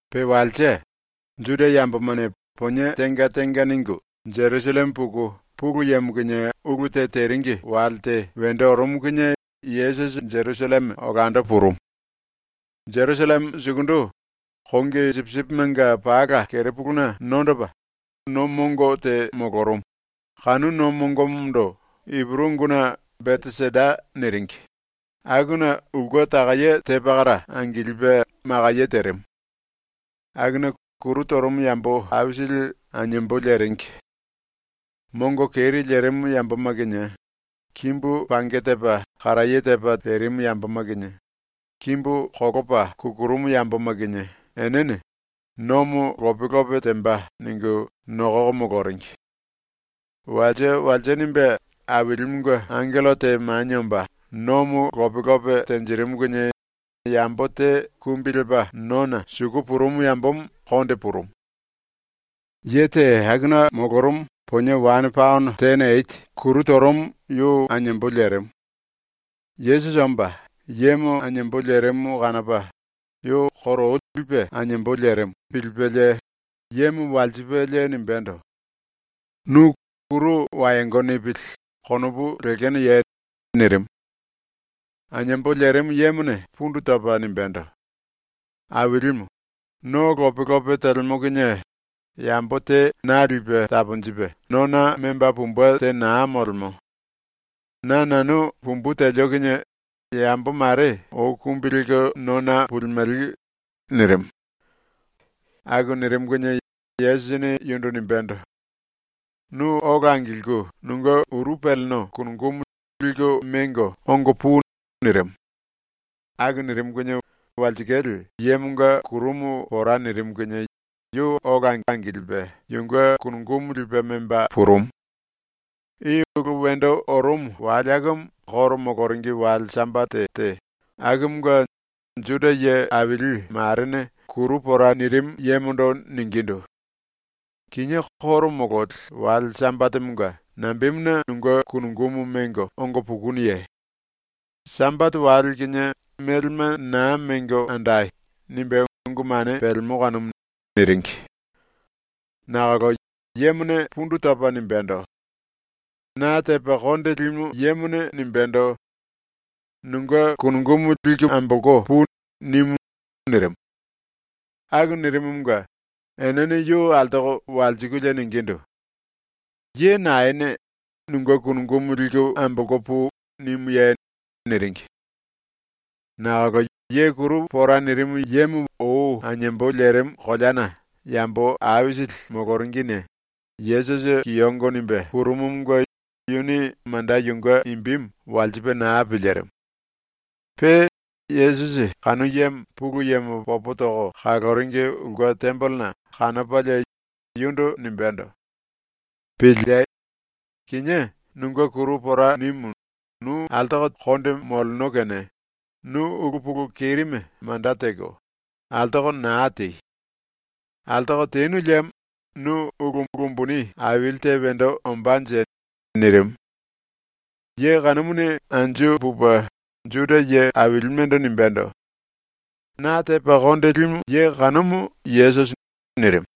Pe walse, Juda yambomane ponie tenga tenga ningu Jerusalleme puku Pulu Yemo kinie ulu te teringi wale te wendo orumu kinie Yesusi Jerusalleme olando purumu. Jerusalleme sukundu, kongi sipisipimenga pala kerepuluna nondopa, no mongo te molorumu, kanu no mongomondo Ipuru unguna ‘Beteseda’ niringi, akuna ulke takaye te pakara angilipe makaye terimu. Akuna kuru torumu yambo aisili aniembo leringi. Mongo keri lerimu yamboma kinie, kimbu pange tepa karaye tepa perimu yamboma kinie, kimbu kolopa kukurumu yamboma kinie enene (‘Nomo lope lope temba.’ ningu nokoko moloringi. Walse walse nimbe Ailimunge angello te manie omba nomo lope lope tenjirimu kinie yambo te kumbi lepa nona suku purumu yambomo konde purumu.) Ye te akuna molorumu ponie wane paono tene eti kuru torumu yu aniembo lerimu. Yesusi omba, yemo aniembo lerimu kanopa, yu koro ou lipe aniembo lerimu pilipelie, yemo walsipelie nimbendo: “Nu ‘kuru wayongo nipili.’ konopu lekenoye?” nirimu. Aniembo lerimu yemone pundu topa nimbendo: “Ailimu, no lope lope telemo kinie yambo te na lipe taponjipe nona memba pumbe te naa molemo. Na nanu pumbu telio kinie yambo mare ou kumbi lelko nona pulimele.” nirimu. Aku nirimu kinie Yesusini yundu nimbendo: “Nu ola angilku nunge uru peleno kunungumu liku mengo ongo pui.” nirimu. Aku nirimu kinie walsikale yemonga kurumu pora nirimu kinie yu ola angilipe yunge kunungumu lipe memba purumu. I ulu wendo orumu wale akumu ⸤Juda yambomanga koro moloringi⸥ wale Sambate te, akumunge Juda ye ⸤aili⸥ marene kuru pora nirimu yemondo ningindu: “Kinié ⸤koro mololi⸥ wale Sambatemonga nambemuna nunge kunungumu mengo ongo pukunuye? ‘Sambate wale kinie melema naa mengo andai.’ nimbe ungu mane pelemo kanumu.” niringi. Nakolo yemone pundu topa nimbendo: “Na tepa konde limu yemone nimbendo: ‘Nunge kunungumu liku ambolko pui.’ nimu.” nirimu. Aku nirimumunge enene yu altoko walsikulie ningindu: “Ye naene ‘Nunge kunungumu liku ambolko pui.’ nimuye?” niringi. Nakolo ye kuru pora nirimu yemo ou aniembo lerimu koleana yambo aisili moloringine Yesusi kiyongo nimbe purumumunge yuni manda yunge imbimu walsipe naa pilirimu. Pe Yesusi kanu yemo ⸤Pulu Yemo popo toko kaloringi⸥ ulke tembelena kanopalie yundu nimbendo: “Piliei. Kinié nunge kuru pora nimu nu altoko konde moleno kene nu ulu pulu kerime manda teko, altoko naa tei! Altoko tenu liemo nu ulu umbuni aili te wendo ombánje.” nirimu. Ye kanumuni anju pupe Juda ye ailimendo nimbendo: “Na tepa konde limu kanumu Yesusi.” nirimu.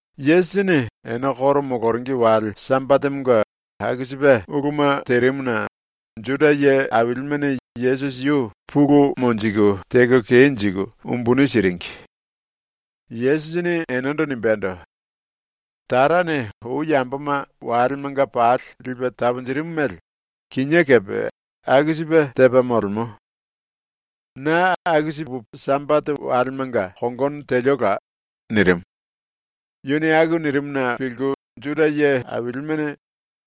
Yesusini ene koro moloringi wale Sambatemonga aku sipe uluma terimuna Juda ye ailimene Yesusi yu pulu monjiku teko kenjiku umbuni siringi. Yesusini enendo nimbendo: “Tarane ou yamboma walemanga pali lipe taponjirimu mele kinié kepe aku sipe tepa molemo. Na aku sipe Sambate walemanga kongono teliola.” nirimu. Yuni aku nirimuna pilku Juda ye ailimene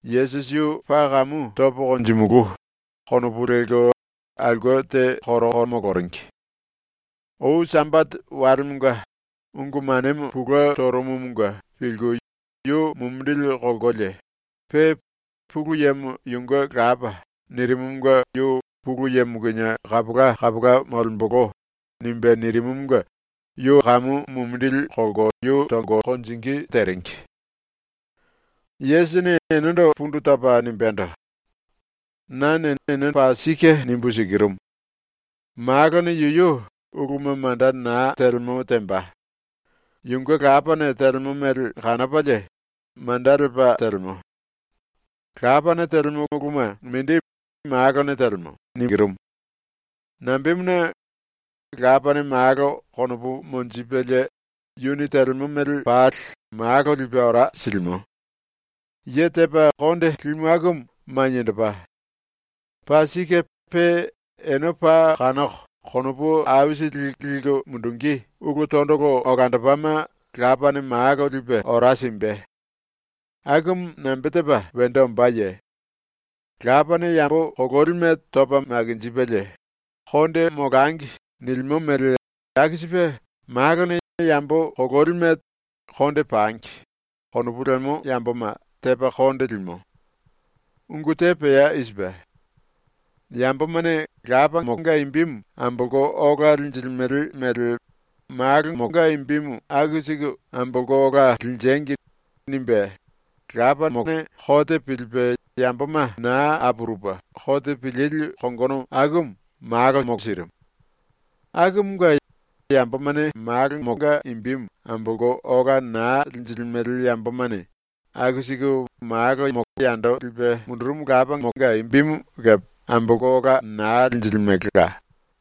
‘Yesusi yu paa kamu topo konjimulu.’ konopu lelko aulke te koroko moloringi. Ou Sambate walemonga ungu manemo pulue torumumunge pilku yu mumindili kolkolie; pe “Pulu Yemo yunge lapa.” nirimumunge yu ‘Pulu Yemo kinie kapola kapola molembolo.’ nimbe nirimumunge yu kamu mumindili kolko yu tonge teringi. Yesusini enendo pundu topa nimbendo: “Nane ene paa sike nimbu sikirumu: Malone yuyu uluma manda naa telemo temba. Yunge Lapane telemo mele kanopalie manda lepa telemo. Lapane telemo uluma mindi Malone telemo. Nambemuna, Lapane Malo konopu monjipelie yuni telemo mele pali Malo lipe ora silimo. Ye tepa konde limu akumu maniendopa. Paa sike pe ene paa kanoko konopu aisili liku mundungí ulu tondolo olandopama Lapane Malo lipe ora simbe. Akumu nambe tepa wendo ombáye? Lapane yambo kololime topa makinjipelie ‘Konde molangi.’ nilimo mele aku sipe Malone yambo kololime ‘Konde pangi.’ konopu lemo yamboma tepa konde limo. Ungu te pea i sipe: ‘Yambomane Lapanga imbimu ambolko ola linjilimele mele Malonga imbimu aku siku ambolko ola linjengi.’ nimbe Lapane kote pilipe yamboma naa apurupe kote pilili kongono akumu Malo sirimu. Akumunge yambomane Malonga imbimu ambolko ola naa linjilimele yambomane aku siku Malo yando lipe mundurumu Lapanga imbimu kepe ambolko ola naa linjilimelela.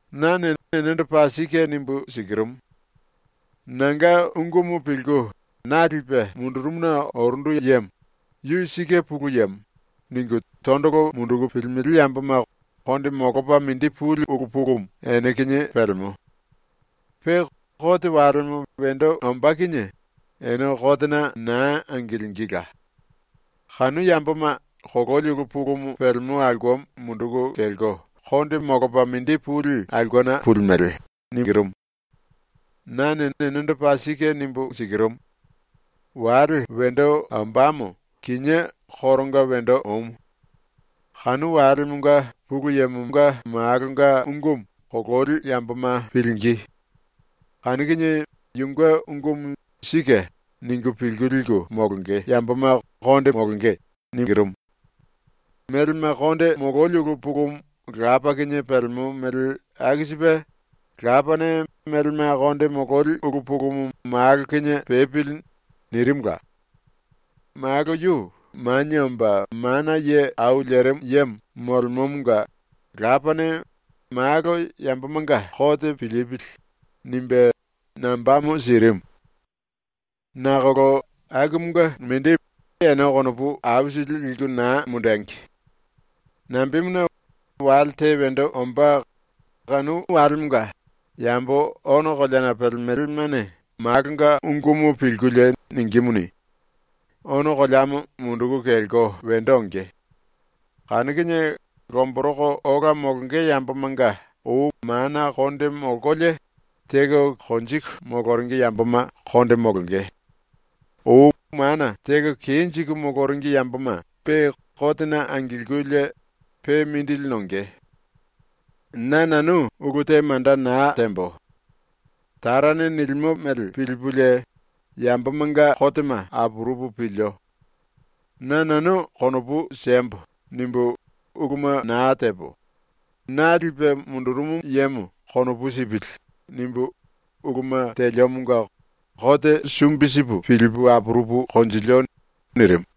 “Nane enendo paa sike nimbu sikirumu: Nanga ungumu pilku, na lipe mundurumuna orundu yemo ‘Yu sike Pulu Yemo.’ ningu tondolo munduku pilimele yamboma konde molopa mindi puli ulu pulumu ene kinie pelemo. Pe kote walemo wendo ombá kinie ene kotena naa angilingíla. Kanu yamboma kololi ulu pulumu pelemo aulkemo munduku kelko konde molopa mindi puli aulkena pulimele. Nane enendo paa sike nimbu sikirumu: Wale wendo ombámo kinié koronga wendo omu. Kanu walemonga Pulu Yemo Malonga ungumu kololi yamboma pilingí. Kanu kinie yunge ungumu ‘Sike’ ningu pilku liku molonge yamboma konde molonge. Melema konde mololi ulu pulumu Lapa kinie pelemo mele aku sipe Lapane ‘Melema konde mololi ulu pulumu Malo kinie pepili.’ nirimula. Malo yu Manie Omba Mana Ye Au Lerimu Yemo molemomonga Lapane ‘Malo yambomanga kote pilipili.’ nimbe nambamo sirimu. “Nakolo akumunge mindi ene konopu aisili liku naa mundengi. Nambemuna, wale te wendo ombá, kanu walemonga yambo ono koleana pelemelemane Malonga ungumu pilkulie ningímuni, ono koleamo munduku kelko wendo onge. Kanu kinie lomboroko ola molonge yambomanga ou mana konde molkolie teko konjiku moloringi yamboma konde molonge; ou mana teko kenjiku moloringi yamboma pe kotena angilkulie pe mindili nonge. “Na nanu ulu te manda naa tembo. Tarane nilimo mele pilipulie yambomanga kotema apurupu pilio. ‘Na nanu konopu siembo.’ nimbu uluma naa tepo, ‘Na lipe mundurumu yemo konopu sipili.’ nimbu uluma teliomonga kote sumbi sipu pilipu apurupu konjilio. ⸤nirimu.⸥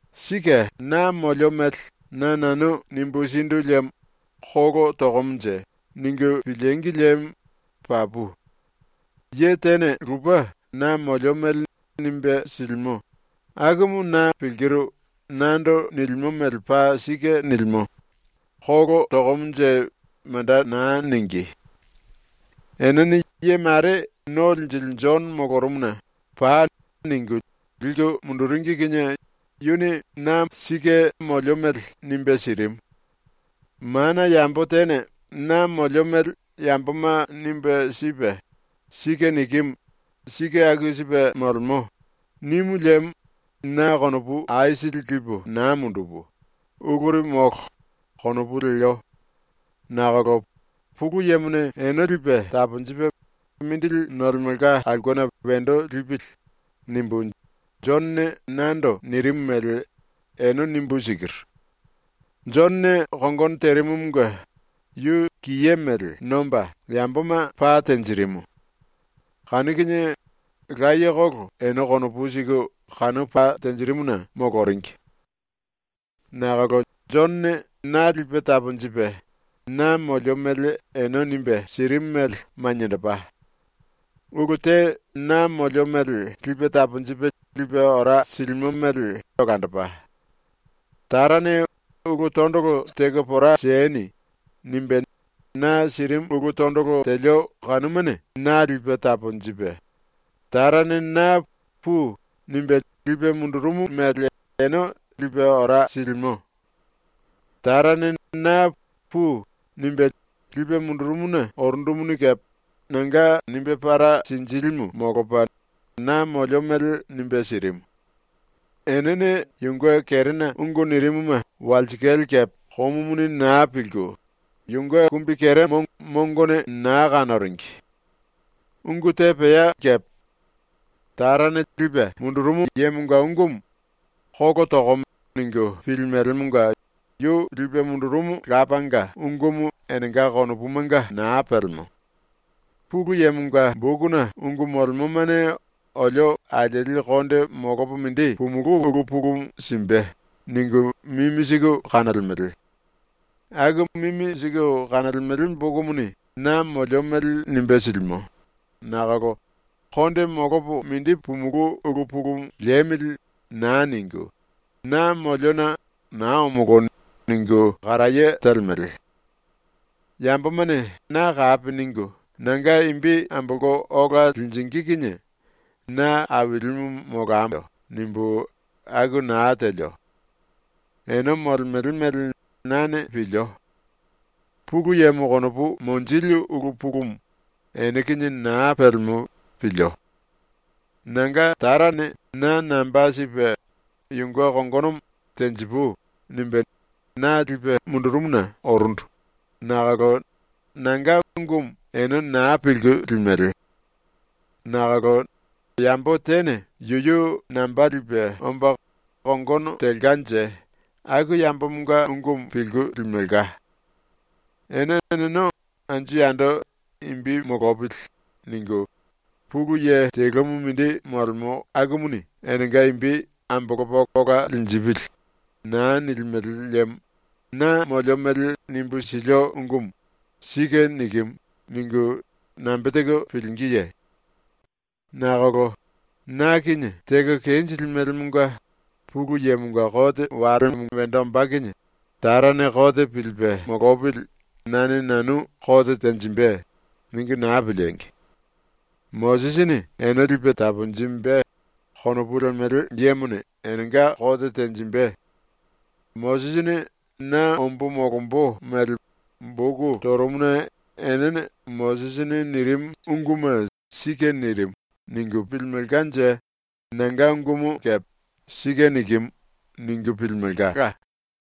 “Sike na molio mele na nanu nimbu sindu liemo ‘Kolo tokomonje.’ ningu pilíngi liemo papu. Ye tene lupe na molio mele nimbe silimo, akumu na pilkiru nando nilimo mele paa sike nilimo, ‘Kolo tokomonje.’ manda naa ningí. “Enene ye mare ⸤No Linjili⸥ Jono molorumuna “Pai.” ningu liku munduringi kinie yuni na molio mele ‘sike’ nimbe sirimu. Mana yambo tene na molio mele yamboma nimbe sipe “Sike nikimu. Sike aku sipe molemo.” nimu liemo na konopu aisili lipu naa mundupu, ‘Uluri molo.’ konopu lelio, nakolo ‘Pulu Yemone ene lipe taponjipe mindili nolemelka aulkena wendo lipili.’ nimbu Jonone nando nirimu mele ene nimbu sikiru. Jonone kongono terimumunge yu kiye mele nomba yamboma pa tenjirimu. Kanu kinie layekolo ene konopu siku kanu pa tenjirimuna moloringi. “Nakolo Jonone na lipe taponjipe na molio mele ene nimbe sirimu mele maniendopa. Ulu te na molio mele lipe taponjipe lipe ora silimo mele olandopa. Tarane “Ulu tondolo teko pora sieni.” nimbe na sirimu ulu tondolo telio kanumane na lipe taponjipe, Tarane na “Pui.” nimbe lipe mundurumu mele ene lipe ora silimo. Tarane na “Pui.” nimbe lipe mundurumuna orundumuni kepe nanga nimbe para sinjílimu molopa na molio mele nimbe sirimu. Enene yunge kerena ungu nirimuma walsikale kepe komumuni naa pilku, yunge kumbikeremo mongone naa kanoringi. Ungu te pea kepe. Tarane lipe mundurumu yemonga ungumu “Kolo tokomo.” ningu pilimelemonga yu lipe mundurumu Lapanga ungumu enenga konopumanga naa pelemo. ‘Pulu Yemonga bokuna ungu molemomane olio alieli konde molopo mindi pumulú ulu pulumu simbe.’ ningu mimi siku kanolemele. Aku mimi siku kanolemele bokumuni na molio mele nimbe silimo nakolo ‘Konde molopo mindi pumulú ulu pulumu liemili.’ naa ningu, na moliona ‘naa omolo.’ ningu karaye telemele. “‘Yambomane na kapi ningu nanga imbi ambolko ola linjingí kinie na ailimu molambo.’ nimbu aku naa telio. Ene molemele mele nane pilio. Pulu Yemo konopu monjili ulu pulumu ene kinie naa pelemo pilio. Nanga Tarane na namba sipe yunge kongonomo ‘tenjipui.’ nimbe na lipe mundurumuna orundu nakolo nanga ungumu ene naa pilku limele. Nakolo yambo tene yuyu namba lipe omba kongono telkanje aku yambomonga ungumu pilku limelka. Ene eneno anju yando ‘imbi molopili.’ ningu, Pulu Ye telumu mindi molemo akumuni enenga imbi ‘ambolopa ola linjipili.’ naa nilimele liemo na molio mele nimbu silio ungumu ‘Sike nikimu.’ ningu nambe teko pilingíye? “Nakolo ⸤na kinie⸥ teko kenjilimelemonga ‘Pulu Yemonga kote walemo wendo ombá kinie Tarane kote pilipe molopili nane nanu kote tenjimbe.’ ningu naa piliengi! ‘Mosisini ene lipe taponjimbe.’ konopu lemele yemone enenga kote tenjimbe. Mosisini na ombo molombo mele boku torumuna enene ‘Mosisini nirimu unguma sike nirimu.’ ningu pilimelkanje nanga ungumu kepe ‘Sike nikimu.’ ningu pilimelka.